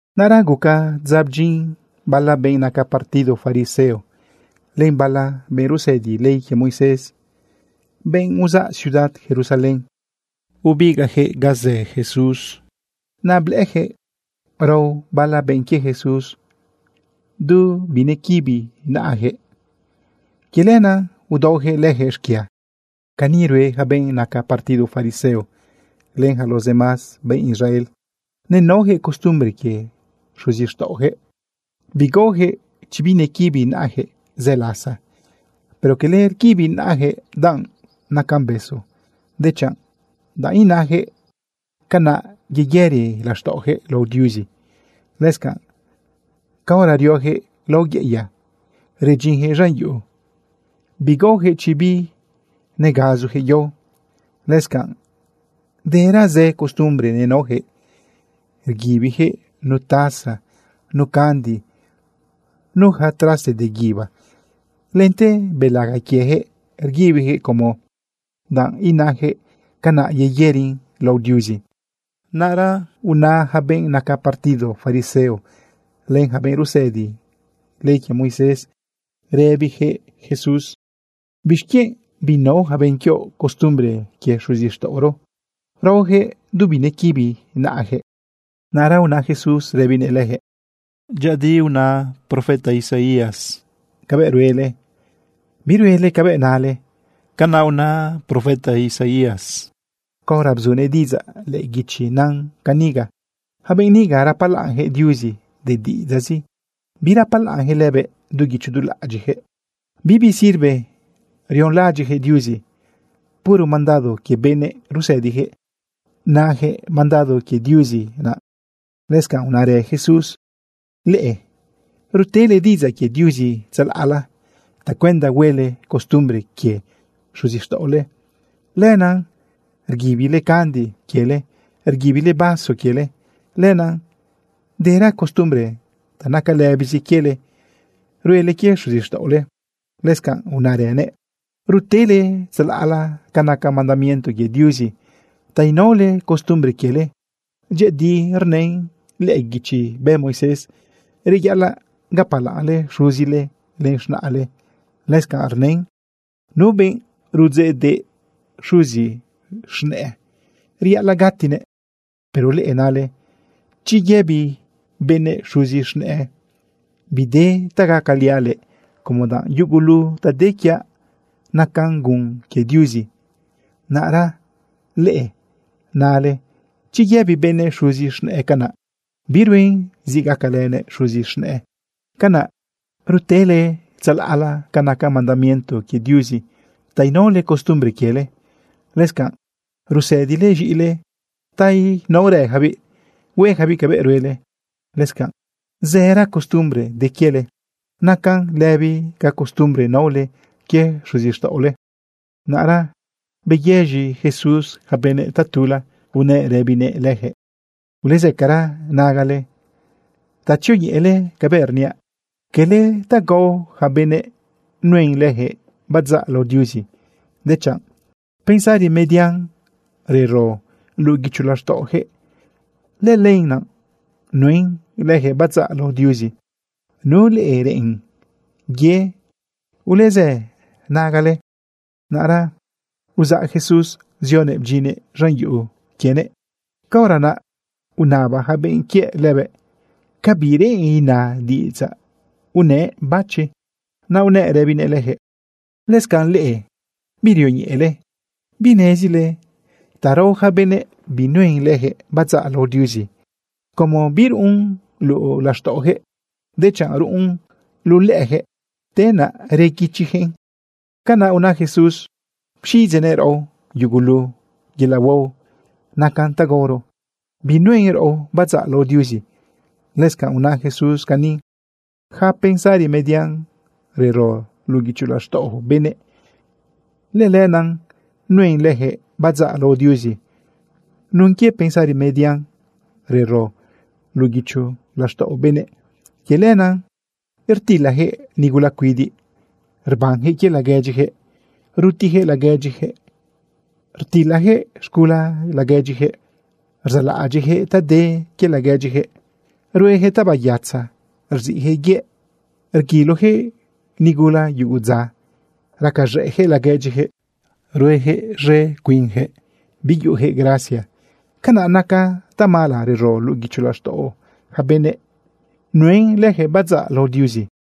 Naꞌra guca dza bdyin bala benꞌ naca partido fariseo len bala benꞌ rusëdi ley quie Moisés, benꞌ uzaꞌ ciudad Jerusalén, bebigaꞌyaquëꞌ ga zë Jesús. Naꞌ blëꞌëyaquëꞌ rao bala benꞌ quie Jesús du binequibi naꞌayaquëꞌ. Quie lenaꞌ udaoyaquëꞌ leyaquëꞌ xquia. (Cani rue yaca benꞌ naca partido fariseo len yaca los demás benꞌ Israel. Nenaoyaquëꞌ costumbre quie xuzixtaꞌoyaquëꞌ, bigaoyaquëꞌ chi binequibi naꞌayaquëꞌ zë lasa. Pero quele rguibi naꞌayaquëꞌ danꞌ nacan besu, dechanꞌ danꞌ inayaquëꞌ canaꞌ yeyëri laxtaꞌoyaquëꞌ lao Diuzi. Lëscanꞌ, caora rioyaquëꞌ lao yeꞌeya redyinyaquëꞌ z̃an yuꞌu, bigaoyaquëꞌ chi binegazuyaquëꞌ yao. Lëscanꞌ dera zë costumbre nenaoyaquëꞌ, rguibiyaquëꞌ nu taza, nu candi, nu yaca traste de guíba. Lente belaga quieyaquëꞌ rguibiyaquëꞌ como danꞌ inayaquëꞌ canaꞌ yeyërin lao Diuzi.) Naꞌra una yaca benꞌ naca partido fariseo len yaca benꞌ rusëdi ley quie Moisés, rëbiyaquëꞌ Jesús: ―¿Bixquienꞌ binao yaca benꞌ quioꞌ costumbre quie xuzixtaꞌoro? Raoyaquëꞌ du binequibi naꞌayaquëꞌ. Naꞌra una Jesús rëbinëꞌ leyaquëꞌ: ―Dyëꞌëdi una Moisés cabëꞌ ruele, biruele cabëꞌ nale. Canaꞌ una Moisés caora bzunëꞌ diꞌidzaꞌ lëꞌë guichi nan ca niga: Yaca benꞌ niga rapalaꞌnyaquëꞌ Diuzi de diꞌidzaꞌzi, birapalaꞌnyaquëꞌ lëbëꞌ du guicho du laꞌadyiꞌyaquëꞌ. Bibi sirve rionlaꞌadyiꞌyaquëꞌ Diuzi. Puro mandado quie benëꞌ rusëdiyaquëꞌ nayaquëꞌ mandado quie Diuzi naꞌ. Lëscanꞌ unarë Jesús: ―Leꞌe rutele diꞌidzaꞌ quie Diuzi tzalaꞌla tacuenda huele costumbre quie xuzixtaꞌole. Lenaꞌ rguibile candi quiele, rguibile vaso quiele. Lenaꞌ dera costumbre ta naca lëbizi quiele ruele quie xuzixtaꞌole. Lëscanꞌ unaranëꞌ: ―Rutele tzalaꞌla ca naca mandamiento quie Diuzi ta inaole costumbre quiele. Dyëꞌëdi rnën lëꞌë guichi bë Moisés: “Reyaꞌalaꞌ gapalaꞌnle xuzile len z̃naꞌle.” Lëscanꞌ rnën: “Nu benꞌ rudzeꞌdeꞌ xuzi z̃nëꞌë, reyaꞌalaꞌ gatinëꞌ.” Pero leꞌe nale chi yëbi benëꞌ xuzi z̃nëꞌë: “Bide ta gacaliaꞌ leꞌe, como danꞌ yugulu ta de quiaꞌ nacan gun quie Diuzi.” Naꞌra leꞌe nale chi yëbi benëꞌ xuzi z̃nëꞌë canaꞌ, biruen zi gacalënëꞌ xuzi z̃nëꞌë. Canaꞌ rutele tzalaꞌla ca naca mandamiento quie Diuzi ta inaole costumbre quiele. Lëscanꞌ rusëdile z̃iꞌile ta inaorëyacabiꞌ hueyacabiꞌ cabëꞌ ruele. Lëscanꞌ zëra costumbre de quiele nacan lëbi ca costumbre naole quie xuzixtaꞌole. Naꞌra beyëz̃i Jesús yaca benëꞌ tatula unëꞌ rëbinëꞌ leyaquëꞌ: ―Ulezëcara nagale ta tzioñeꞌele cabëꞌ rniaꞌ. Quele ta gao yaca benëꞌ nuen leyaquëꞌ badzaꞌ lao Diuzi, dechanꞌ pensari median rero luꞌu guicho laxtaꞌoyaquëꞌ, lëlenaꞌ nuen leyaquëꞌ badzaꞌ lao Diuzi. Nu leꞌe reꞌen ye, ulezë nagale. Naꞌra uzaꞌ Jesús zionëꞌ bdyinnëꞌ z̃an yuꞌu quienëꞌ. Caora naꞌ unaba yaca benꞌ quiëꞌ lëbëꞌ ca bi reꞌen ina diꞌidzaꞌ unëꞌ bachi. Naꞌ unëꞌ rëbinëꞌ leyaquëꞌ: ―¿Lëscanꞌ leꞌe birioñeꞌele? ¿Binezile ta rao yaca benëꞌ binuen leyaquëꞌ badzaꞌ lao Diuzi, como biruꞌun luꞌu laxtaꞌoyaquëꞌ, dechanꞌ ruꞌun luꞌu lëꞌëyaquëꞌ, te naꞌ rguichiyaquëꞌn? Canaꞌ una Jesús pxiꞌidzeꞌnëꞌ raꞌo yugulu yelaꞌ huao nacan ta gaoro, binuen raꞌo badzaꞌ lao Diuzi. Lëscanꞌ una Jesús cani: ―Yaca pensari median rero luꞌu guicho laxtaꞌo benëꞌ, lëlenaꞌ nuen leyaquëꞌ badzaꞌ lao Diuzi. Nun quie pensari median rero luꞌu guicho laxtaꞌo benëꞌ, quie lenaꞌ rtilayaquëꞌ nigula cuidiꞌ, rbanyaquëꞌ quie laguedyiyaquëꞌ, rutiyaquëꞌ laguedyiyaquëꞌ, rtilayaquëꞌ z̃gula laguedyiyaquëꞌ, rzaꞌlaꞌadyiꞌyaquëꞌ ta de quie laguedyiyaquëꞌ, rueyaquëꞌ tabayatza, rziꞌyaquëꞌ yëꞌ, rguiloyaquëꞌ nigula yugu dza, racaz̃ëꞌjëꞌ laguedyiyaquëꞌ, rueyaquëꞌ z̃e cuinyaquëꞌ, biyuꞌuyaquëꞌ gracia. Canaꞌ naca tamala rero luꞌu guicho laxtaꞌo yaca benëꞌ nuen leyaquëꞌ badzaꞌ lao Diuzi.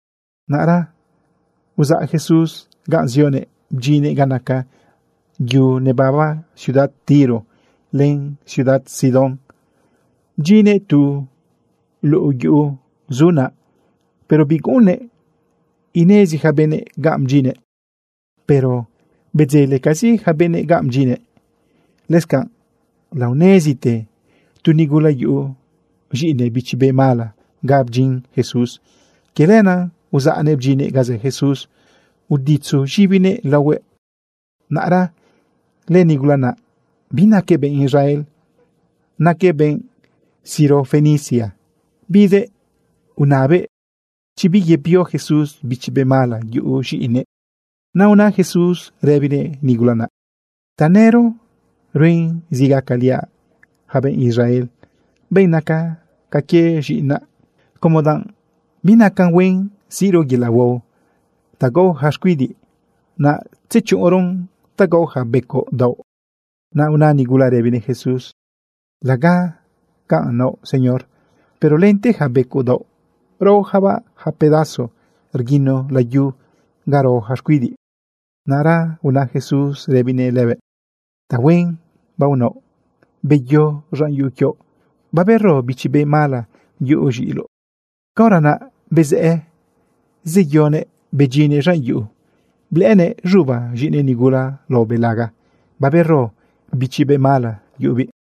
Naꞌra uzaꞌ Jesús ganꞌ zioguëꞌ bdyinnëꞌ ga naca yu nebaba ciudad Tiro len ciudad Sidón. Bdyinnëꞌ tu luꞌu yuꞌu zu naꞌ, pero biguꞌunnëꞌ inezi yaca benëꞌ ganꞌ bdyinnëꞌ, pero bedzelecazi yaca benëꞌ ganꞌ bdyinnëꞌ. Lëscanꞌ laonezite tu nigula yuꞌu z̃iꞌinëꞌ bichi be mala ga bdyin Jesús. Quie lenaꞌ uzaꞌnëꞌ bdyinnëꞌ ga zë Jesús uditzu z̃ibinëꞌ laohuëꞌ. Naꞌra lënigula naꞌ binaquëꞌ benꞌ Israel, naquëꞌ benꞌ Sirofenicia. Bidëꞌ unabëꞌ chi biyebio Jesús bichi be mala yuꞌu z̃iꞌinëꞌ. Naꞌ una Jesús rëbinëꞌ nigula naꞌ: ―Tanëro ruen zi gacaliaꞌ yaca benꞌ Israel, benꞌ naca ca quie z̃iꞌinaꞌ, como danꞌ binacan huen siꞌro yelaꞌ huao ta gao yaca xcuidiꞌ, naꞌ tzechuꞌunroꞌn ta gao yaca becoꞌ daoꞌ. Naꞌ una nigula rëbinëꞌ Jesús: ―Laga canꞌ naoꞌ, Señor, pero lente yaca becoꞌ daoꞌ raoyacabaꞌ yaca pedazo rguino layu ga rao yaca xcuidiꞌ. Naꞌra una Jesús rëbinëꞌ lëbëꞌ: ―Tahuen baonaoꞌ. Beyo z̃an yuꞌu quioꞌ. Babero bichi be mala yuꞌu z̃iꞌiloꞌ. Caora naꞌ bezëꞌë zeyoguëꞌ bedyinnëꞌ z̃an yuꞌu, blëꞌënëꞌ z̃uba z̃iꞌinëꞌ nigula lao belaga, babero bichi be mala yuꞌubiꞌ.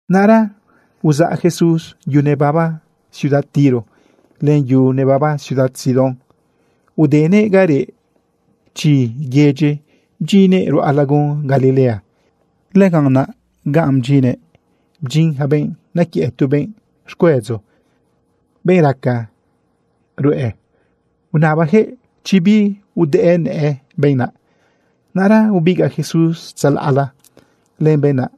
Naꞌra uzaꞌ Jesús yu nebaba ciudad Tiro, len yu nebaba ciudad Sidón. Udenëꞌ ga reꞌ chi yedyi bdyinnëꞌ ruꞌa lagun Galilea. Lëganꞌ naꞌ ga bdyinnëꞌ, bdyin yaca benꞌ nequiëꞌ tu benꞌ xcuedzo, benꞌ rcaca ruꞌe. Unabayaquëꞌ chi biudëꞌë nëꞌë benꞌ naꞌ. Naꞌra ubigaꞌ Jesús tzalaꞌla len benꞌ naꞌ,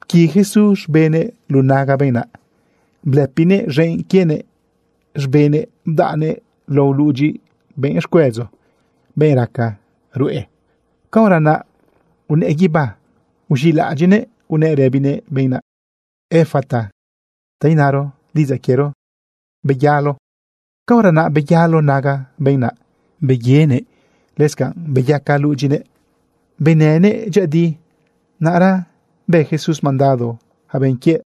pqui Jesús z̃benëꞌ luꞌu naga benꞌ naꞌ, blëpinëꞌ z̃enꞌ quienëꞌ z̃benëꞌ bdaꞌnëꞌn lao ludyi benꞌ xcuedzo, benꞌ rcaca ruꞌe. Caora naꞌ unëꞌë guibá, uz̃iꞌlaꞌadyiꞌnëꞌ unëꞌ rëbinëꞌ benꞌ naꞌ: ―¡Efata! ―ta inaro diꞌidzaꞌ quiero: ¡Beyalo! Caora naꞌ beyalo naga benꞌ naꞌ barenëꞌ. Lëscanꞌ beyaca ludyinëꞌ benënëꞌ dyëꞌëdi. Naꞌra bë Jesús mandado yaca benꞌ quiëꞌ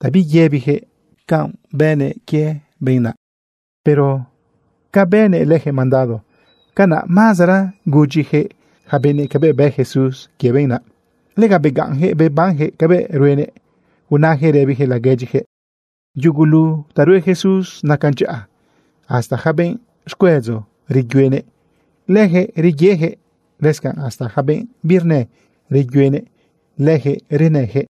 ta biyëbiyaquëꞌ canꞌ bënëꞌ quie benꞌ naꞌ. Pero ca bënëꞌ leyaquëꞌ mandado, canaꞌ mazara gudyiyaquëꞌ yaca benëꞌ cabëꞌ bë Jesús quie benꞌ naꞌ. Lega begaꞌnyaquëꞌ bebanyaquëꞌ cabëꞌ ruenëꞌ unayaquëꞌ rëbiyaquëꞌ laguedyiyaquëꞌ: ―Yugulu ta rue Jesús nacan dyaꞌa. Hasta yaca benꞌ xcuedzo, reyuenëꞌ leyaquëꞌ reyeyaquëꞌ, lëscanꞌ hasta yaca benꞌ birnë, reyuenëꞌ leyaquëꞌ renëyaquëꞌ.